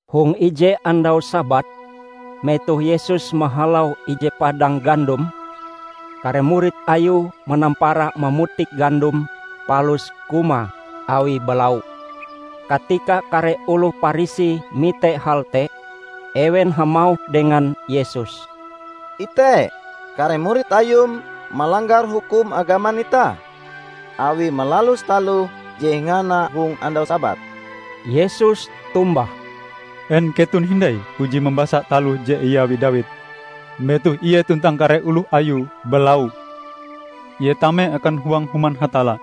Hong ije andau Sabat, metoh Yesus mahalau ije padang gandom, kare murid Ayue manampara mamutik gandom palus kumae awi balau. Katika kare oloh Parisi mite hal te, ewen hamauh dengan Yesus, "Ite! Kare murid Ayum malanggar hukum agaman itah awie malalus taloh je ingahana hong andau Sabat." Yesus tombah, "En keton hindai puji mambasa taloh je iawi Dawid metoh ie tuntang kare oloh ayue balau? Ie tame akan huang Human Hatalla;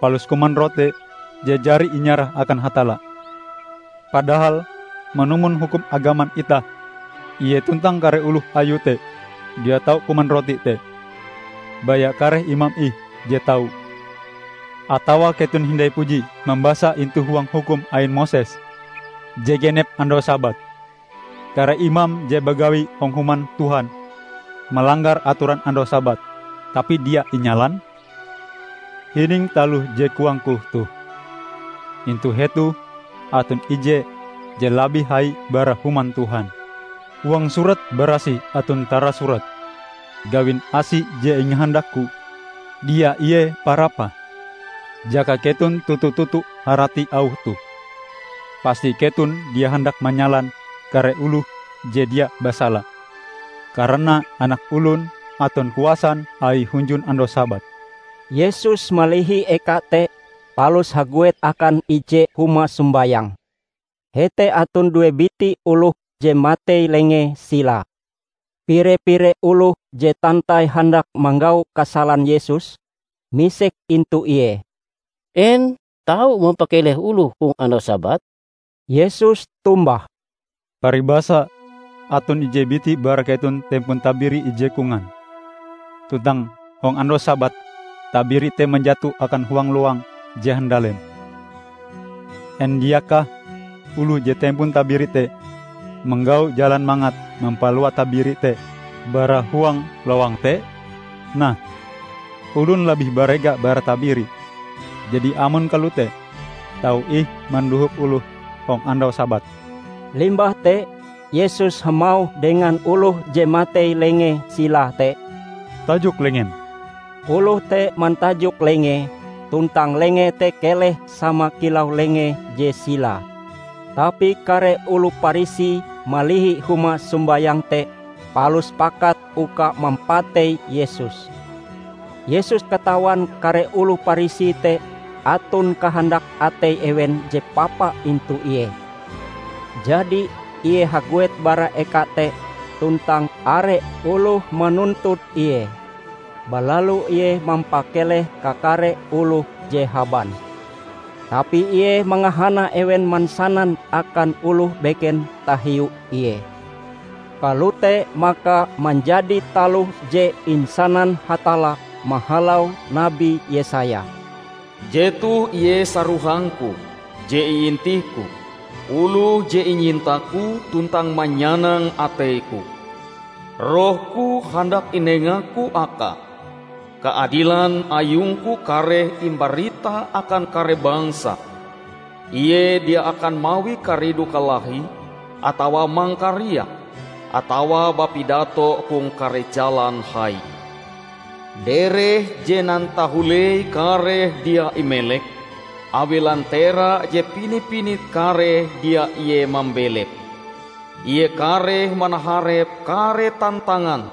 palus kuman rote je jari inyarah akan Hatalla. Padahal manumon hukum agaman itah, ie tuntang kare oloh ayue te dia tau kuman rote te -- baya kare imam ih je tau. Atawa keton hindai puji mambasa intu huang hukum ain Moses je genep andau Sabat, kare imam je bagawi hong Human Tuhan, malanggar atoran andau Sabat, tapi dia inyalan? Hining taloh je koang-Ku toh: intu hetoh aton ije je labih hai bara Human Tuhan. Huang Surat Barasih aton tarasurat: Gawin asi je ingahandak-Ku, dia ie parapah. Jaka keton toto-toto harati auh toh, pasti keton dia handak manyalan kare oloh je dia basala. Karana Anak Olon aton kuasan Aie hunjun andau Sabat." Yesus malihi eka te palus haguet akan ije huma sombayang. Hete aton due biti oloh je matei lengee silae. Pire-pire oloh je tantai handak manggau kasalan Yesus, misek intu Ie, "En tau mampakeleh oloh hong andau Sabat?" Yesus tombah, "Paribasa aton ije biti bara keton tempon tabiri ije kongan, tuntang hong andau Sabat tabiri te manjato akan huang lowang je handalem; en diakah oloh je tempon tabiri te manggau jalan mangat mampalua tabiri te bara huang lowang te? Nah, olon labih barega bara tabiri! Jadi, amon kalote, tau ih mandohop oloh hong andau Sabat." Limbah te Yesus hamauh dengan oloh je matei lengee silae te, "Tajok lengem." Oloh te mantajok lengee, tuntang lengee te keleh sama kilau lengee je silae. Tapi kare oloh Parisi malihi huma sombayang te, palus pakat uka mampatei Yesus. Yesus katawan kare oloh Parisi te aton kahandak atei ewen je papa intu Ie. Jadi Ie haguet bara eka te tuntang are oloh manuntut Ie. Balalu Ie mampakeleh kakare oloh je haban. Tapi Ie mangahana ewen mansanan akan oloh beken tahiu Ie. Kalote maka manjadi taloh je insanan Hatalla mahalau nabi Yesaya, "Jetoh ie sarohang-Ku je iintih-Ku Oloh je inyinta-Ku tuntang manyanang atei-Ku. Roh-Ku handak inenga-Ku Akae, kaadilan ayung-Ku kareh imbarita akan kare bangsa. Ie dia akan mawi karidu kalahi atawa mangkariak, atawa bapidato hong kare jalan hai. Dereh je nantahulei kareh dia imelek Awie lantera je pini-pinit kareh dia Ie mambelepe. Ie kareh manaharep kare tantangan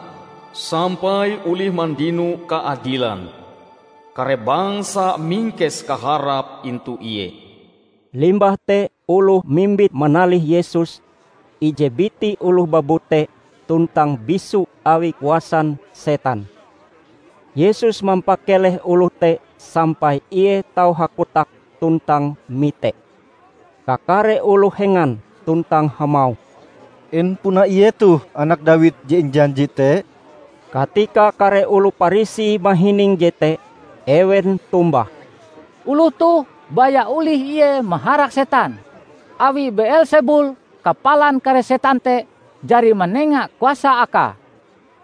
sampai olih mandino kaadilan; Kare bangsa mingkes kaharape intu Ie." Limbah te oloh mimbit manalih Yesus ije biti oloh babute tuntang bisu awi kuasan setan. Yesus mampakeleh oloh te sampai ie tau hakotak tuntang mite. Kakare oloh hengan tuntang hamauh, "En puna Ie toh Anak Dawid je injanji te?" Katika kare oloh Parisi mahining jete, ewen tombah, "Oloh toh baya olih Ie maharak setan, awi Beelsebul, kapalan kare setan te, jari manenga kuasa Akae."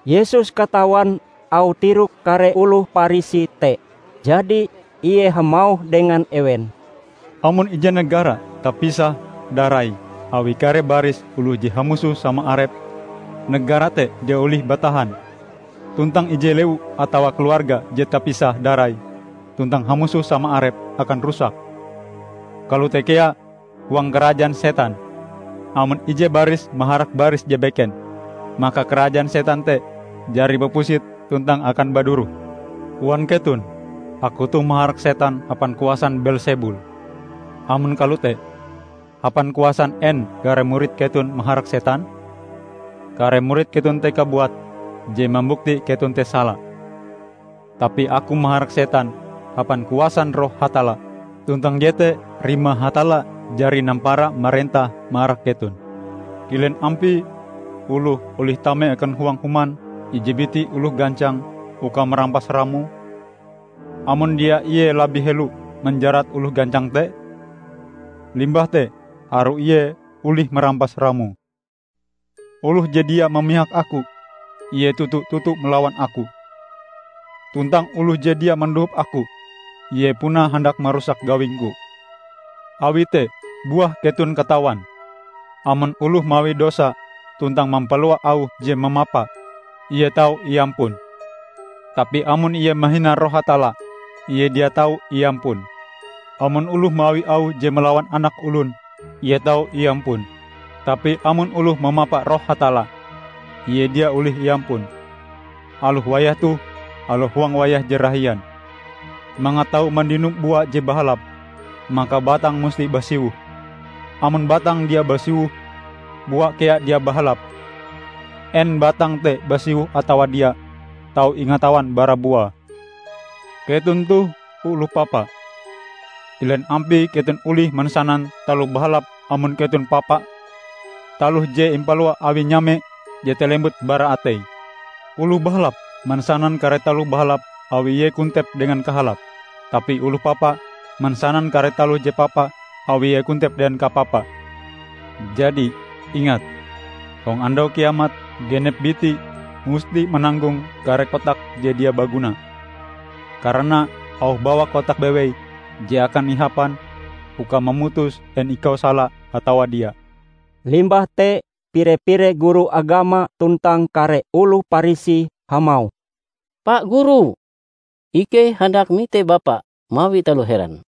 Yesus katawan auh tirok kare oloh Parisi te. Jadi, Ie hamauh dengan ewen, "Amon ije negara tapisah-darai awi kare baris oloh je hamusoh sama arepe, negara te dia olih batahan, tuntang ije lewu atawa keluarga je tapisah-darai tuntang hamusoh sama arepe, akan rusak. Kalote kea huang karajaan setan; amon ije baris maharak baris je beken, maka karajaan setan te jari bapusit tuntang akan baduroh. Koan keton Aku toh maharak setan hapan kuasan Beelsebul! Amon kalote, hapan kuasan en kare murid keton maharak setan? Kare murid keton te kabuat je mambukti keton te sala! Tapi Aku maharak setan hapan kuasan Roh Hatalla. Tuntang jete rimae Hatalla jari nampara marentah marak keton. Kilen ampie oloh olih tame akan huang human ije biti oloh gancang uka marampas ramoe, amon dia ie labih helo manjarat oloh gancang te? Limbah te harue ie olih marampas ramoe. Oloh je dia mamihak Aku, ie toto-toto malawan Aku. Tuntang oloh je dia mandohop Aku, ie puna handak marusak gawing-Ku! Awi te buah keton katawan, amon oloh mawi dosa tuntang mampalua auh je mamapa, ie tau iampun! Tapi amon ie mahina Roh Hatalla, ie dia tau iampun! Amon oloh mawi auh je malawan Anak Olon, ie tau iampun, tapi amon oloh mamapa Roh Hatalla, ie dia olih iampun, aloh wayah toh aloh hong wayah je rahian!" "Mangat tau mandino bua je bahalap, maka batang musti basiwoh. Amon batange dia basiwoh, buae kea dia bahalap. En batange te basiwoh atawa dia, tau ingatawan bara buae. Keton toh oloh papa, kilen ampie keton olih mansanan taloh bahalap amon keton papa. Taloh je impalua awi nyame, jete lembut bara atei! Oloh bahalap mansanan kare taloh bahalap awi ie kontep dengan kahalap. Tapi oloh papa mansanan kare taloh je papa awi ie kontep dengan kapapa. Jadi, ingat: hong Andau Kiamat genep biti musti mananggong kare kotake je dia baguna. Karana auh bawak kotakm bewei je akan ihapan uka mamutus en ikau sala atawa dia." Limbah te pire-pire guru agama tuntang kare oloh Parisi hamauh, "Pa Guru, ikei handak mite Bapa mawi taloh heran."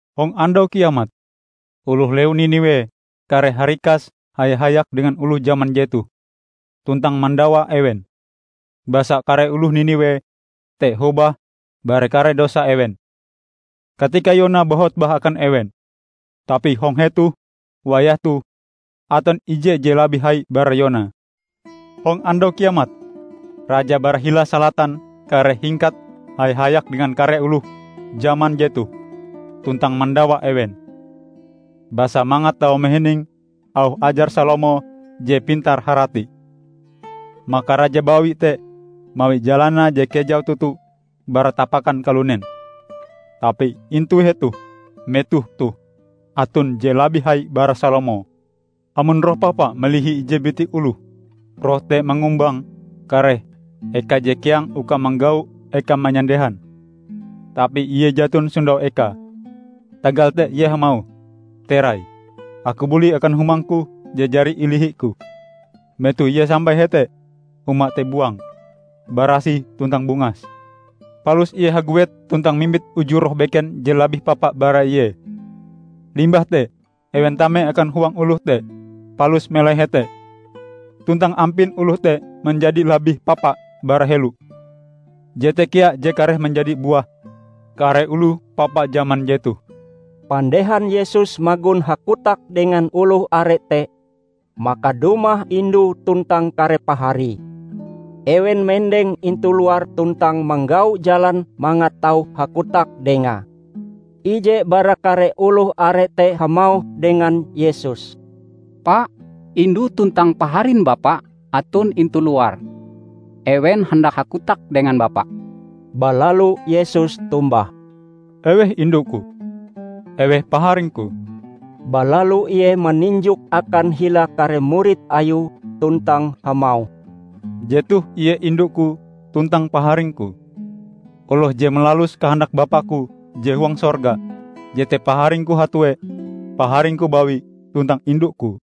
Hong Andau Kiamat, oloh lewu Niniwe kareh harikas haya-hayak dengan oloh jaman jetoh tuntang mandawa ewen. Basa kare oloh Niniwe te hobah bara kare dosan ewen, katika Yona bahotbah akan ewen. Tapi hong hetoh wayah toh aton ije je labih hai bara Yona! Hong Andau Kiamat, raja bara hila Salatan kareh hingkat haya-hayak dengan kare oloh jaman jetoh tuntang mandawa ewen. Basa mangat tau mahining auh ajar Salomo je pintar harati, maka raja bawi te mawi jalanae je kejau toto bara tapakan kalunen. Tapi intu hetoh metoh toh aton je labih hai bara Salomo!" "Amon roh papa malihi ije biti oloh, roh te mangumbang kare eka je keang uka manggau ekae manyandehan, tapi ie jaton sondau ekae. Tagal te ie hamauh, 'Terai, aku buli akan humangku je jari ilihiku.' Metoh ie sampai hete, huma te buang, barasih tuntang bungas. Palus ie haguet tuntang mimbit uju roh beken je labih papa bara ie. Limbah te ewen tame akan huang oloh te, palus melai hete. Tuntang ampin oloh te menjadi labih papa bara helo. Jete kea je kareh menjadi buah kare oloh papa jaman jetoh." Pandehan Yesus magon hakotak dengan oloh are te, maka dumah indue tuntang kare paharie. Ewen mendeng intu luar tuntang manggau jalan mangat tau hakotak Dengae. Ije bara kare oloh are te hamauh dengan Yesus, "Pa, indu tuntang paharin Bapa aton intu luar. Ewen handak hakotak dengan Bapa." Balalu Yesus tombah, "Eweh indu-Ku? Eweh paharing-Ku?" Balalu ie maninjok akan hila kare murid Ayue tuntang hamauh, "Jetoh ie indu-Ku tuntang paharing-Ku. Oloh je malalus kahandak Bapa-Ku je huang sorga, jete paharing-Ku hatue, paharing-Ku bawi tuntang indu-Ku."